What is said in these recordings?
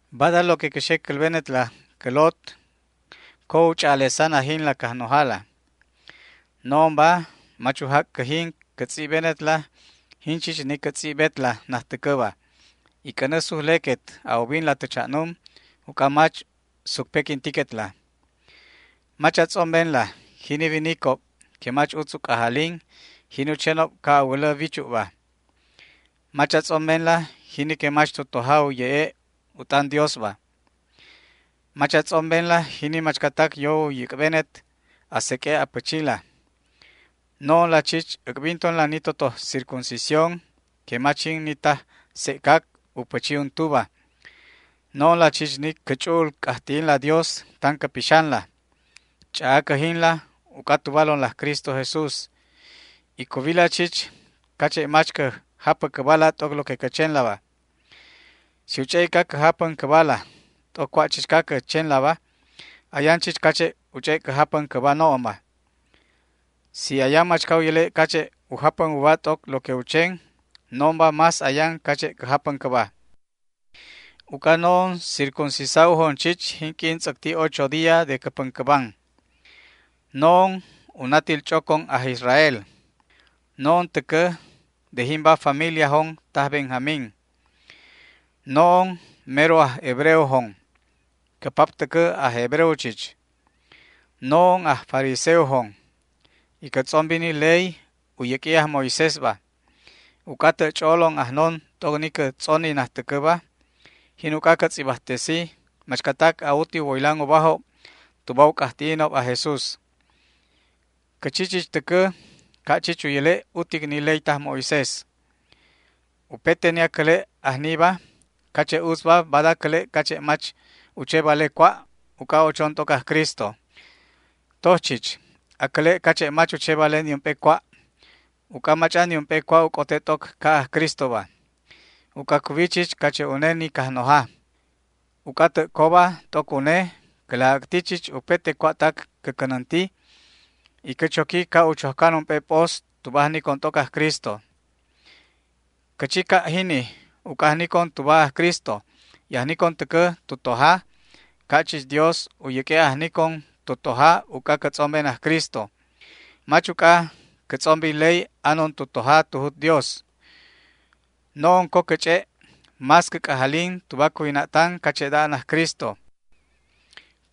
Bada lo que cä xe cälbenetla, cä lot, co u ch'a'alesan ajinla Cajnojala. No'onba mach u jac' cäjin cä tz'ibbenetla jin chich ni cä tz'ibbetla najtäcäba, y c'änä sujlequet a ubinla tä cha'num, uc'a mach sucpequintiquetla. Mach a tz'ombenla jini winicob que mach utz u c'ajalin jini u chenob ca' a wälä wichu'ba. Mach a tz'ombenla jini que mach tu toja u ye'e' u t'an Diosba. Mach a tz'ombenla jini machcatac yo u yäc'benet a seq'ue' a pächila. No'onla chich a'bintonla ni totoj circuncisión que mach jin ni taj sec'cac u pächi untuba. No'onla chich ni cä ch'u'ul c'ajti'inla Dios tan cä pixanla, ch'a'a cäjinla uc'a tubalonla aj Cristo Jesús, y cuwila chich cache' mach cä japä cäbala t'oc lo que cä chenlaba. Si u ch'e'ica cä japän cäbala t'oc cua' chichca cä chenlaba, ayan chich cache'da u ch'e' cä japän cäba no'onba. Si ayan machca u yäle' cache' u japän uba t'oc lo que u chen, no'onba más ayan cache' cä japän cäba. Uc'a no'on circuncisa'ujon chich jinq'uin tz'äcti ocho día de cä päncäban. No'on u natil ch'ocon aj Israel. No'on täcä de jimba familiajon taj Benjamín. No'on mero aj hebreojon, cä pap täcä aj hebreo chich. No'on aj fariseojon, y cä tz'ombi ni ley u yäq'ui aj Moisésba. Uc'a tä' ch'o'o ajnon t'oc ni cä tz'oni najtäcäba, jin uc'a cä tz'ibajtesi machcatac a'uti u woylan ubajob tuba u c'ajti'inob aj Jesús. Cä chi chich täcä ca' chich u yäle' utic ni ley taj Moisés. Upete ni acäle' ajniba cache' utzba, bada cäle' cache' mach u che vale cua', uc'a ochon t'oc aj Cristo. Toj chich acäle' cache' mach u che vale niump'e cua', uc'a mach'an niump'e cua' u c'ote t'oc ca' aj Cristoba, uc'a cuwi chich cache' une ni Cajnoja. Uc'a tä' coba t'oc une, cä laj äcti chich upete cua'tac cä cänänti, y cä choqui ca' u chojcan ump'e p'os, tuba ajnicon t'oc aj Cristo. Cä chi ca' jini uc'a ajnicon tuba aj Cristo y ajnicon täcä tu toja, ca' chich Dios u yäq'ue' ajnicon tu toja uc'a cä tz'omben aj Cristo. Mach uc'a cä tz'ombi ley anon tu toja tu jut Dios. No'on co cä ch'e' más cä c'ajalin tuba cuwina'tan cache'da an aj Cristo.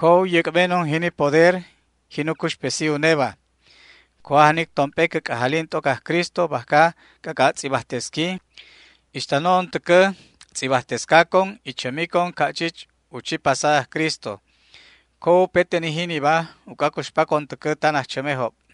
Co u yäc'benon jini poder jin u cuxpesi uneba. Co ajnic tomp'e cä c'ajalin t'oc aj Cristo bajca c'ac'a' tz'ibajtesqui, ixta no'on täcä tz'ibajtescacon y chämicon ca' chich u chi pasa aj Cristo. Co upete ni jiniba uc'a cuxpacon täcä tan ajchämejob.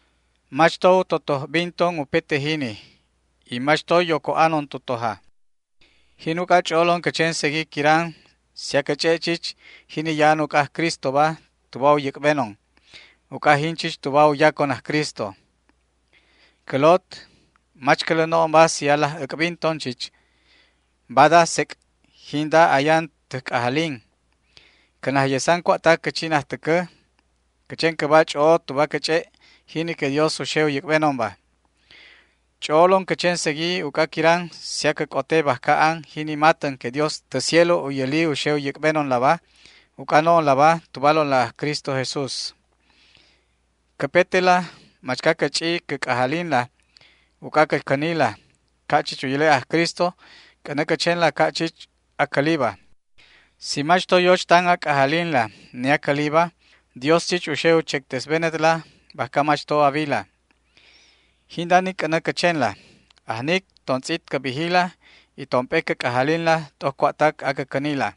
Mach to u totoj binton upete jini, y mach to yoco anon tu toja. Jin uc'a ch'o'olon cä chen segui quiran si acä ch'e' chich jini ya'an uc'a aj Cristoba tuba u yäc'benon, uc'a jin chich tuba u yacon aj Cristo. Cä lot, mach cälä no'onba si alaj äc'binton chich. Bada sec' jinda ayan täj c'ajalin, cä najyesan cua'tac cä chi najtäcä, cä chen cäba ch'o'o tuba cä ch'e' jini que Dios u xe u yäc'benonba. Ch'o'olon cä chen segui uc'a quiran si acä c'ote bajca an jini matän que Dios tä cielo u yäli u xe u yäc'benonlaba uc'a no'onlaba tubalonla aj Cristo Jesús. Cäpetela machca cä ch'i cä c'ajalinla uc'a cä cänila ca' chich u yäle' aj Cristo c'änä cä chenla ca' chich acäliba. Si mach to yoch tan a c'ajalinla ni acäliba, Dios chich u xe u chectesbenetla bajca mach to a wila. Jinda ni c'änä cä chenla, ajnic tontz'it cä bijila y tomp'e cä c'ajalinla t'oc cua'tac acä cänila.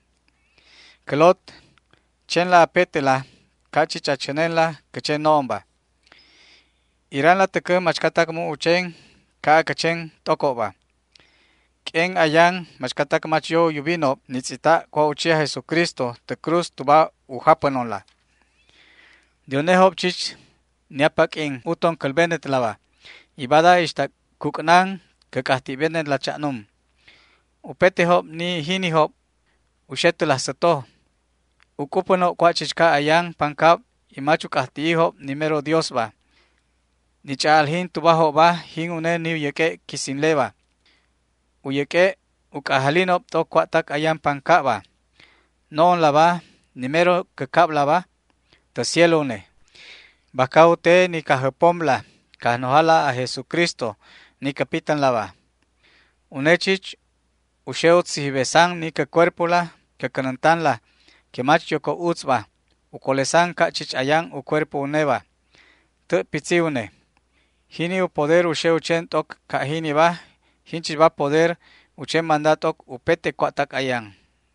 Cä lot, chenla apetela ca' chich a chänenla cä chen no'onba. Iranla täcä machcatac mu' u chen ca' acä chen t'ocobba. Q'uen ayan machcatac mach yo u yubinob ni tz'ita' cua' u chi aj Jesucristo tä cruz tuba u japänonla. De unejob chich ni apaq'uin uton cälbenetlaba, y bada ixta cuc'nan cä c'ajti'benetla cha'num. Upetejob de ni jinijob u xe tä laj säto. U c'upänob cua' chichca ayan pancab y mach u c'ajti'ijob ni mero Diosba. Ni ch'a'aljin tubajobba jin une ni u yäq'ue' quisinleba. U yäq'ue' u c'ajalinob t'oc cua'tac ayan pancabba. No'onlaba ni mero cä cablaba tä cielo une, bajca u te ni Cajjäpomla Cajnojala aj Jesucristo ni cä pitänlaba. Une chich u xe u tzijibesan ni cä cuerpola cä cänäntanla que mach yoco utzba u colesan ca' chich ayan u cuerpo uneba, tä' pitzi une. Jini u poder u xe u chen t'oc ca' jiniba, jinchichba poder u chen manda t'oc upete cua'tac ayan.